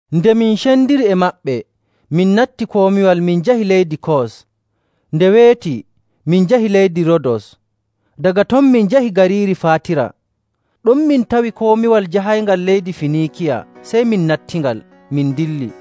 Nde min cendiri e maɓɓe, min natti komiwal, min njahi leydi Kos. Nde weeti, min njahi leydi Roodos, daga ton min njahi gariiri Faatira. Ɗon min tawi komiwal jahayngal leydi Finiikiya, sey min nattingal, min ndilli.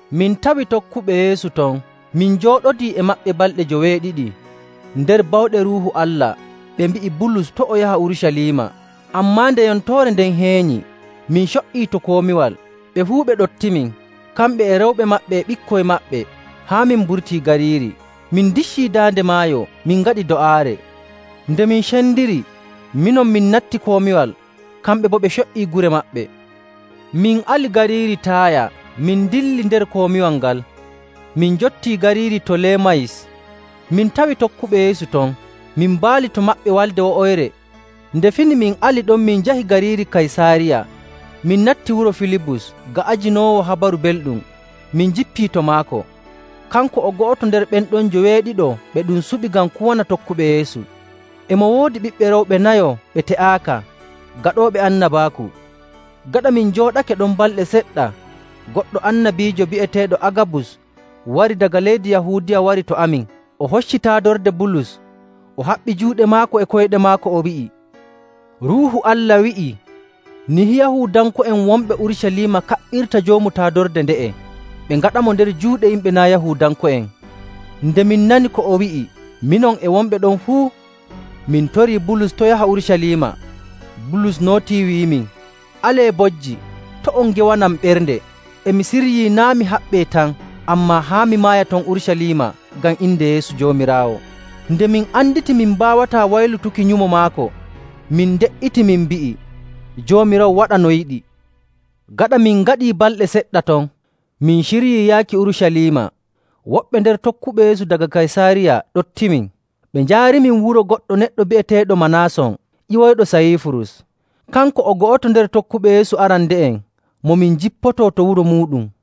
Min tawi tokkuɓe Yeesu ton, min njooɗodii e maɓɓe balɗe joweeɗiɗi. Nder bawɗe Ruuhu Allah ɓe mbi'i Bulus to' o yaha Urucaliima. Ammaa nde yontoore nden heenyi, min co''ii to komiwal. Ɓe fuu ɓe ɗoftimin, kamɓe e rewɓe maɓɓe e ɓikkoy maɓɓe, haa min mburtii gariiri. Min ndiccii daande maayo, min ngaɗi do'aare. Nde min cendiri, minon min natti komiwal, kamɓe boo ɓe co''ii gure maɓɓe. Min ali gariiri Taaya min dilli nder komiwal ngal, min njotti gariiri Tolemayis. Min tawi tokkuɓe Yeesu ton, min mbaali to maɓɓe walnde wo'oyre. Nde fini min ali ɗon, min njahi gariiri Kaysaariya. Min natti wuro Filibus ga'ajinoowo Habaru Belɗum, min njippii to maako. Kanko o go'oto nder ɓen ɗon njoweeɗiɗo ɓe ɗum suɓi ngam kuwana tokkuɓe Yeesu.. E mo woodi ɓiɓɓe rewɓe nayo ɓe te'aaka, gaɗooɓe annabaaku. Gaɗa min njooɗake ɗon balɗe seɗɗa, goɗɗo annabiijo bi'eteeɗo Agabus wari daga leydi Yahuudiya wari to amin.. O hocci taadorde Bulus, o haɓɓi juuɗe maako e koyɗe maako, o wi'i, “Ruuhu Allah wi'ii nihi Yahuudanko'en wonɓe Urucaliima kaɓɓirta joomu taadorde nde'e, ɓe ngaɗamo nder juuɗe yimɓe naa' Yahuudanko'en.” Nde min nani ko o wi'i, minon e wonɓe ɗon fuu, min torii Bulus to' yaha Urucaliima. Bulus nootii, wi'imin, “Alee bojji, to' on ngewanam ɓernde! E mi siryii naa' mi haɓɓee tan, ammaa haa mi maaya ton Urucaliima ngam inde Yeesu Joomiraawo.” Nde min anditi min mbaawataa waylutuki nyumo maako, min nde''iti, min mbi'i, “Joomiraawo waɗa no yiɗi!” Gaɗa min ngaɗii balɗe seɗɗa ton, min ciryii yaaki Urucaliima. Woɓɓe nder tokkuɓe Yeesu daga Kaysaariya ɗoftimin, ɓe njaarimin wuro goɗɗo neɗɗo bi'eteeɗo Manaason ƴiwoyɗo Sayiifurus. Kanko o go'oto nder tokkuɓe Yeesu arande'en mo min njippoto to wuro muuɗum.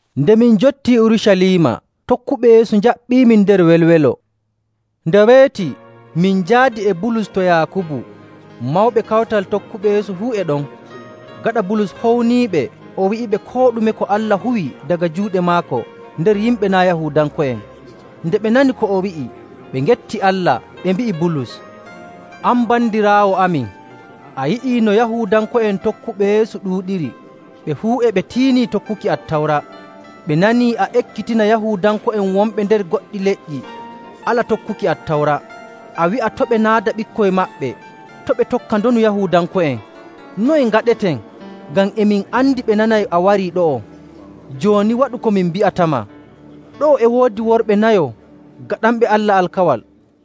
Nde min njottii Urucaliima, tokkuɓe Yeesu njaɓɓimin nder welwelo. Nde weeti min njaadi e Bulus to Yaakubu. Mawɓe kawtal tokkuɓe Yeesu fuu e ɗon. Gaɗa Bulus howniiɓe, o wi'iɓe koo ɗume ko Allah huwi daga juuɗe maako nder yimɓe naa' Yahuudanko'en. Nde ɓe nani ko o wi'i, ɓe ngetti Allah. Ɓe mbi'i Bulus, “An bandiraawo amin, a yi'ii no Yahuudanko'en tokkuɓe Yeesu ɗuuɗiri, ɓe fuu e ɓe tiini tokkuki Attawra. Ɓe nanii a ekkitina Yahuudanko'en wonɓe nder goɗɗi leƴƴi ala tokkuki Attawra, a wi'a to' ɓe naada ɓikkoy maɓɓe, to' ɓe tokka ndonu Yahuudanko'en. Noye ngaɗeten? Ngam e min andi ɓe nanay a warii ɗo'o. Jooni waɗu ko min mbi'atama. Ɗo'o e woodi worɓe nayo gaɗanɓe Allah alkawal.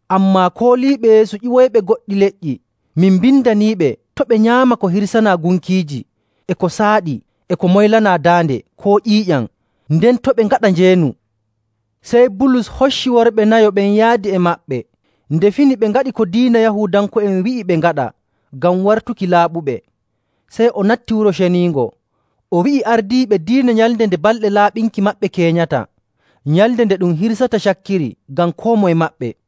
Ammaa kooliiɓe Yeesu ƴiwoyɓe goɗɗi leƴƴi, min mbindaniiɓe to' ɓe nyaama ko hirsanaa gunkiiji e ko saaɗi e ko moylanaa daande, koo ƴiiƴam, nden to' ɓe ngaɗa njeenu.”. Sey Bulus hocci worɓe nayo ɓen yaadi e maɓɓe. Nde fini ɓe ngaɗi ko diina Yahuudanko'en wi'i ɓe ngaɗa ngam wartuki laaɓuɓe. Sey o natti Wuro Ceniingo, o wi'i ardiiɓe diina nyalnde nde balɗe laaɓinki maɓɓe keenyata, nyalnde nde ɗum hirsata cakkiri ngam koo moye maɓɓe.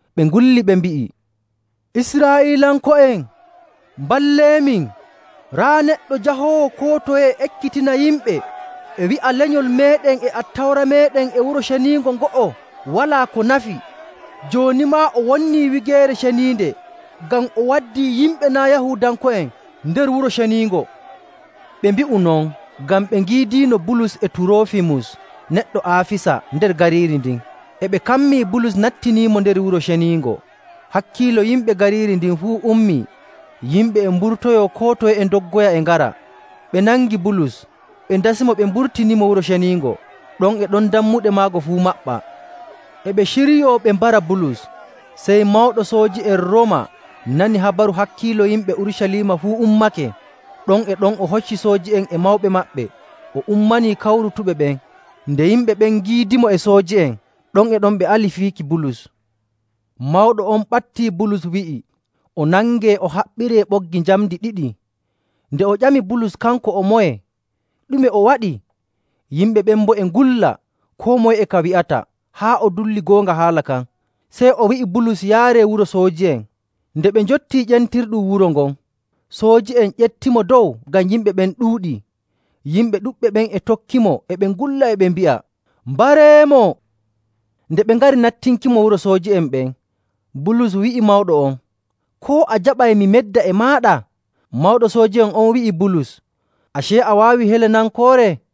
Ɓe ngulli ɓe mbi'i, “Israa'iilanko'en, mballeemin! Raa neɗɗo jahoowo koo toye e ekkitina yimɓe e wi'a lenyol meeɗen e Attawra meeɗen e Wuro Ceniingo ngo'o walaa ko nafi. Jooni maa o wonnii wigeere ceniinde ngam o waddii yimɓe naa' Yahuudanko'en nder Wuro Ceniingo!” Ɓe mbi'u non ngam ɓe ngiidiino Bulus e Turoofimus neɗɗo Aafisa nder gariiri ndin. E ɓe kammii Bulus nattiniimo nder Wuro Ceniingo.. Hakkiilo yimɓe gariiri ndin fuu ummii. Yimɓe e mburtoyoo koo toye e ndoggoya e ngara. Ɓe nangi Bulus ɓe ndasimo ɓe mburtinimo Wuro Ceniingo. Ɗon e ɗon dammuɗe maago fuu maɓɓaa. E ɓe ciryo ɓe mbara Bulus, sey mawɗo sooji'en Rooma nani habaru hakkiilo yimɓe Urucaliima fuu ummake. Ɗon e ɗon, o hocci sooji'en e mawɓe maɓɓe, o ummanii kawrutuɓe ɓen. Nde yimɓe ɓen ngiidimo e sooji'en, ɗon e ɗon ɓe ali fiiki Bulus. Mawɗo on ɓattii Bulus wi'i o nangee o haɓɓiree ɓoggi njamndi ɗiɗi. Nden o ƴami Bulus kanko o moye, ɗume o waɗi? Yimɓe ɓen boo e ngulla. Koo moye e ka wi'ata haa o dulli goonga haala kan. Sey o wi'i Bulus yaaree wuro sooji'en. Nde ɓe njottii ƴentirɗum wuro ngon, sooji'en ƴeftimo dow ngam yimɓe ɓen ɗuuɗii. Yimɓe ɗuɗɓe ɓen e tokkimo e ɓe ngulla e ɓe mbi'a, “Mbareemo!” Nde ɓe ngari nattinkimo wuro sooji'en ɓen, Bulus wi'i mawɗo on, “Koo a jaɓay mi medda e maaɗa?” Mawɗo sooji'en on wi'i Bulus “Acee, a waawi Helenankoore?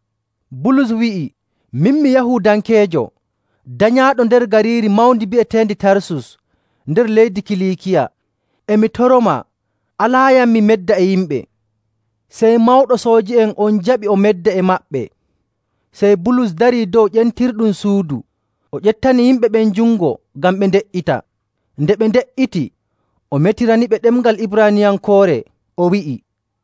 Bulus wi'i, “Min mi Yahuudankeejo danyaaɗo nder gariiri mawndi bi'eteendi Tarsus nder leydi Kiliikiya. E mi toromaa alaayam mi medda e yimɓe.” Sey mawɗo sooji'en on jaɓi o medda e maɓɓe. Sey Bulus darii dow ƴentirɗum suudu, o ƴeftani yimɓe ɓen jungo ngam ɓe nde''ita. Nde ɓe nde''iti, o metiraniɓe ɗemngal Ibraaniyankoore, o wi'i,